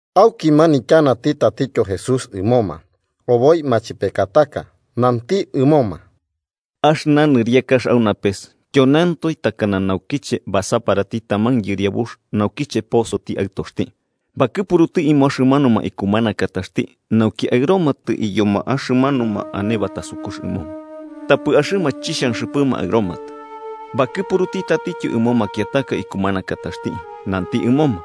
Auki manityanati tatityo Jesús ɨmoma oboi machepekataka. Nanti ɨmoma: “Axɨna nɨriakax au napes tyoneantoe takana nauchiche basaparati taman yɨriabux naukiche posoti aɨtoxti. Bakɨpuruti ɨmo axɨmanuma ikumanakataxti nauki aɨromatɨ iyoma axɨmanuma ane batasukux ɨmoma, tapɨ axɨma chixhanxɨpɨma aɨromatɨ. Bakɨpuruti tatityo ɨmo makiataka ikumanakataxti, nanti ɨmoma: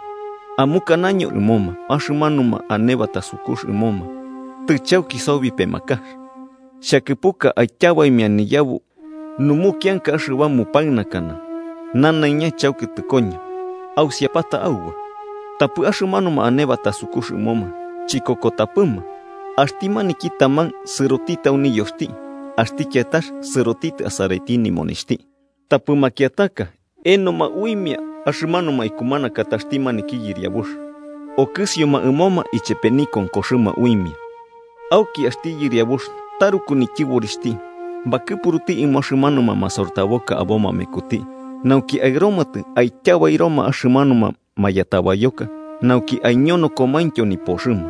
‘Amukanaño ɨmoma axɨmanuma ane batasukux ɨmoma tɨchauki sobi pemakax. Xhakɨpuka aityabaimia niyabu numukianka axɨba mupaɨnakana, nanaiña chauki tɨkoño. Ausiapata auba.’ Tapɨ axɨmanuma ane batasukux ɨmoma chikokotapɨma. Axti maniki taman sɨrotitɨ au niyoxti, axti kiatax sɨrotitɨ asaraiti nimonixhti, tapɨ makiataka enoma uimia axɨmanuma ikumanakataxti maniki yɨriabux, okɨsioma ɨmoma ichepe nikonkoxɨma uimia. Auki axti yɨriabux taruku nityɨborixhti, bakɨpuruti ɨmo axɨmanuma masortaboka aboma mekuti nauki aɨromatɨ aityabairoma axɨmanuma mayatabayoka nauki aiñonokomaintyo nipoxɨma.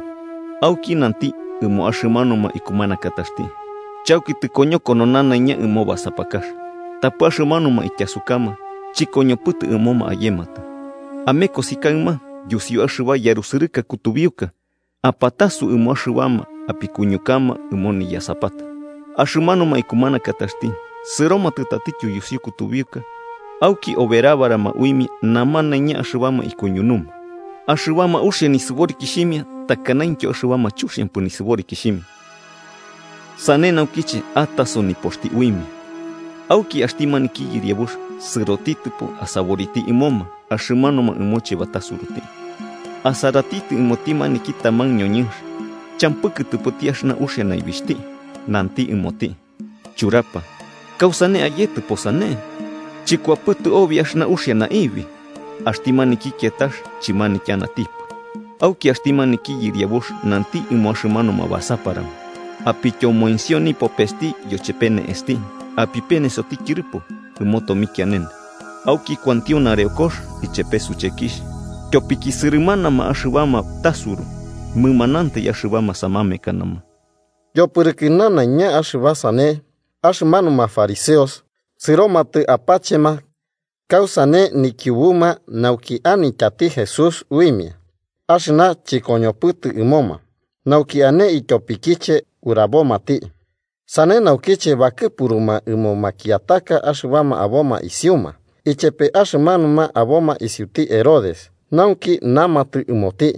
Auki nanti ɨmo axɨmanuma ikumanakataxti: ‘Chauki tɨkoñokono nanaiña ɨmo basapakax, tapɨ axɨmanuma ityasukama chɨkoñopɨtɨ ɨmoma ayematɨ. Amekosi, kaɨma, yusiu axɨba yarusɨrɨka kutubiuka, apatasu ɨmo axɨbama apikuñukama ɨmo niyasapata.’ Axɨmanuma ikumanakataxti sɨromatɨ tatityo yusiu kutubiuka auki oberabarama uimia namanaiña axɨbama ikuñunuma, axɨbama uxia nɨsɨborikixhimia takanaintyo axɨbama chuxiampɨ nisɨborikixhimia. Sane naukiche ataso nipoxti uimia. “Auki axti maniki yɨriabux sɨrotitɨpo asaboriti ɨmoma axɨmanuma ɨmoche batasuruti, asaratitɨ ɨmoti maniki taman ñoñɨnx champɨ kɨtɨpɨti axɨna uxia naibixhti. Nanti ɨmoti: ‘Churapa, ¿kausane ayetɨpo sane, chɨkuapɨtɨ obi axɨna uxia naibi?’ Axti maniki kiatax chɨmanityanatipɨ. Auki axti maniki yɨriabux nanti ɨmo axɨmanuma basaparama: ‘Apityomoensio nipopesti yochepe ne'esti apipenesoti tyɨrɨpo ɨmo tomikianene. Auki kuantio nareokox ichepe suchekixh.’ Tyopiki sɨrɨmanama axɨbama tasuru, mɨmanamantai axɨbama samamekanama.” Yopɨrɨkɨ nanaiña axɨna sane, axɨmanuma fariseos sɨromatɨ apachema kausane nikiubuma nauki anityati Jesús uimia axɨna chɨkoñopɨtɨ ɨmoma nauki ane ityopikiche urabomati. Sane naukiche bakɨpuruma ɨmo makiataka axɨbama aboma isiuma, ichepe axɨmanuma aboma isiuti Herodes, nauki namatɨ ɨmoti: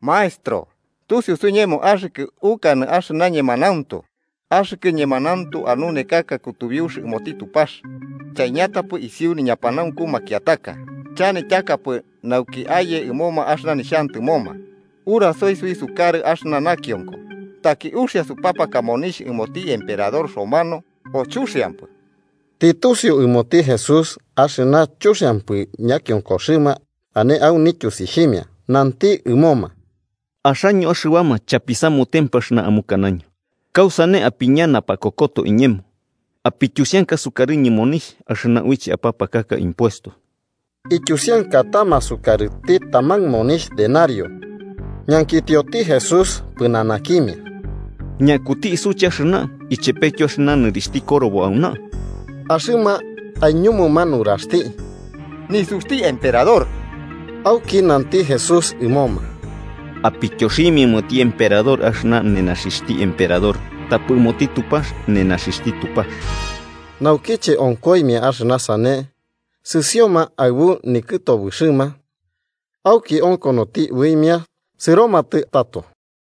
–Maestro, tusiu suiñemo axɨkɨ ukanɨ axɨna ñemanauntu, axɨkɨ ñemanauntu anunekaka kutubiux ɨmoti Tupax, chaiñatapɨ isiu niñapanaunku makiataka, chanityakapɨ nauki aye ɨmoma axɨna nixhantɨmoma. Urasoi, suisukarɨ, axɨna nakionko: ¿Taki uxia supapaka monixh ɨmoti emperador romano, o chuxiampɨ? Tɨtusiu ɨmoti Jesús axɨna chuxiampɨ ñakionkoxɨma ane au nityusixhimia, nanti ɨmoma: –Axaño axɨbama chapisamutempɨ axɨna amukanaño, ¿kausane apiña napakokoto iñemo? Apityusianka sukarɨñɨ monixh axɨna uiche apapaka impuesto. Ityusiankatama sukarɨti taman monixh denario, ñankitioti Jesús pɨnanakimia: –¿Ñakuti isuche axɨna ichepetyo axɨna nɨrixhti korobo auna? Axɨma aiñumuma nuraxti: –Nisuxti emperador. Auki nanti Jesús ɨmoma: –Apityoximia ɨmoti emperador axɨna nenaxixhti emperador, tapɨ ɨmoti Tupax nenaxɨxhti Tupax. Naukiche onkoimia axɨna sane, sɨsioma aɨbu nikɨtobɨxɨma. Auki onkonoti uimia sɨromatɨ tato.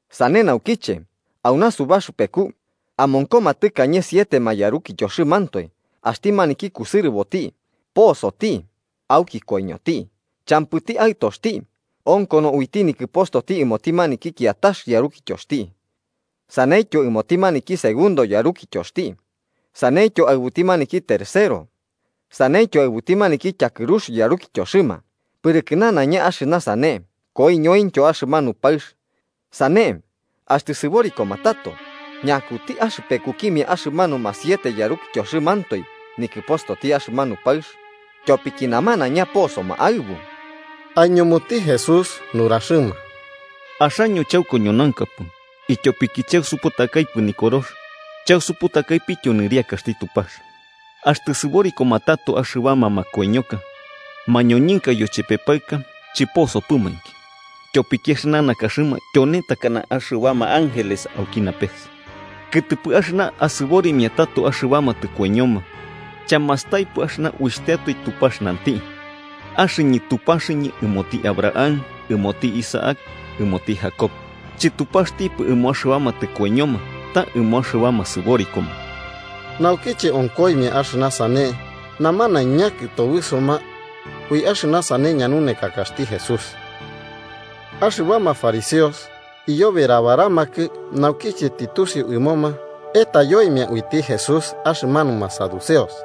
Sane naukiche, auna, subaxɨpeku amonkoma tɨkañe sietema yarukityoxɨmantoe. Axti maniki kusɨrɨboti posoti, auki koiñoti. Champɨti aɨtoxti, onkono uiti nikɨpostoti ɨmoti maniki kiatax yarukityoxti. Saneityo ɨmoti maniki segundo yarukityoxti, saneityo aɨbuti maniki tercero, saneityo aɨbuti maniki tyakɨrux yarukityoxɨma. Pɨrɨkɨ nanaiña axɨna sane koiñointyo axɨmanu paɨx. Sane, axtɨ sɨborikoma tato, ¿ñakuti axɨpekukimia axɨmanuma siete yarukityoxɨmantoe nikɨpostoti axɨmanu paɨx, tyopiki namanaiña posoma aɨbu? Aiñumuti Jesús nuraxɨma: –¡Axaño chaukoñonaunkapɨ, ityopiki chausuputakaipɨ Nikorox chausuputakaipityo nɨriakaxti Tupax! Axtɨ sɨborikoma tato axɨbama makoiñoka, mañoñɨnka yochepe paɨka chɨposopɨmainki, tyopiki axɨna nakaxɨma tyone takana axɨbama ángeles auki napes. Kɨtɨpɨ axɨna asɨborimia tato axɨbama tɨkoiñoma, ¿chamastaipɨ axɨna uixhtiatoe Tupax nanti: ‘Axɨñɨ Tupaxɨñɨ ɨmoti Abraham, ɨmoti Isaac ɨmoti Jacob’? ¡Chɨtupaxtipɨ ɨmo axɨbama tɨkoiñoma, ta ɨmo axɨbama sɨborikoma! Naukiche onkoimia axɨna sane, namanaiña kɨtobɨsoma ui axɨna sane ñanunekakaxti Jesús. Axɨbama fariseos iyoberabaramakɨ naukiche tɨtusiu ɨmoma etayoimia uiti Jesús axɨmanuma saduceos,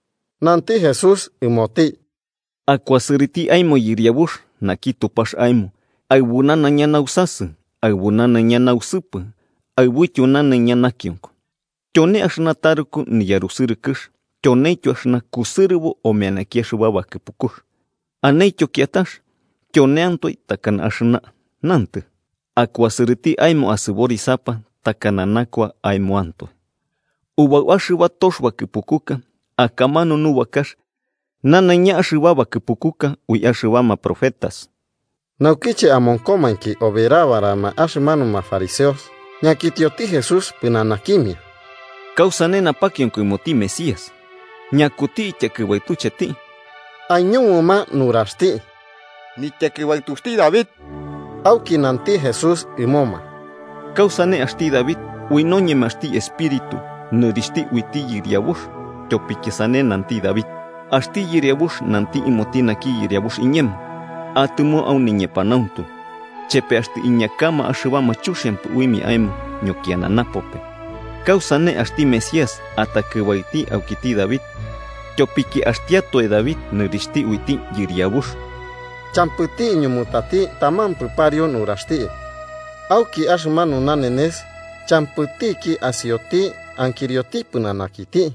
Nanti Jesús ɨmoti: –‘Akuasɨrɨti aemo Yɨriabux naki Tupax aemo aɨbu nanaiña nausasɨ, aɨbu nanaiña nausɨpɨ aɨbuityo nanaiña nakionko.’ Tyone axɨna taruku niyarusɨrɨkɨx tyoneityo axɨna kusɨrɨbo omeanaki axɨba bakɨpukux. Anentyo kiatax, tyoneantoe takana axɨna. Nantɨ: ‘Akuasɨrɨti aemo asɨborisapa takana nakua aemoantoe.’ Ubau axɨba tox bakɨpukuka akamanu nubakax nanaiña axɨba bakɨpukuka ui axɨbama profetas. Naukiche amonkomainki oberabarama axɨmanuma fariseos, Ñankitioti Jesús pɨnanakimia: –¿Kausane napakionko ɨmoti Mesías? ¿Ñakuti ityakɨbaɨtucheti? Aiñumuma nuraxti: –Nityakɨbaɨtuxti David. Auki nanti Jesús ɨmoma: –¿Kausane axti David, ui noñemaxti Espíritu, nɨrixhti uiti Yɨriabux? Tyopiki sane nanti David: ‘Axti Yɨriabux nanti ɨmoti naki Yɨriabux iñemo: Atɨmo au niñepanauntu, chepe axtɨ iñakama axɨbama chuxiampɨ uimia aemo ñokiana napope.’ ¿Kausane axti Mesías atakɨbaɨti aukiti David, tyopiki axtiatoe David nɨrixhti uiti Yɨriabux? Champɨti iñumutati tamampɨ pariu nuraxti, auki axɨmanu nanenes champɨtiki asioti ankirioti pɨnanakiti.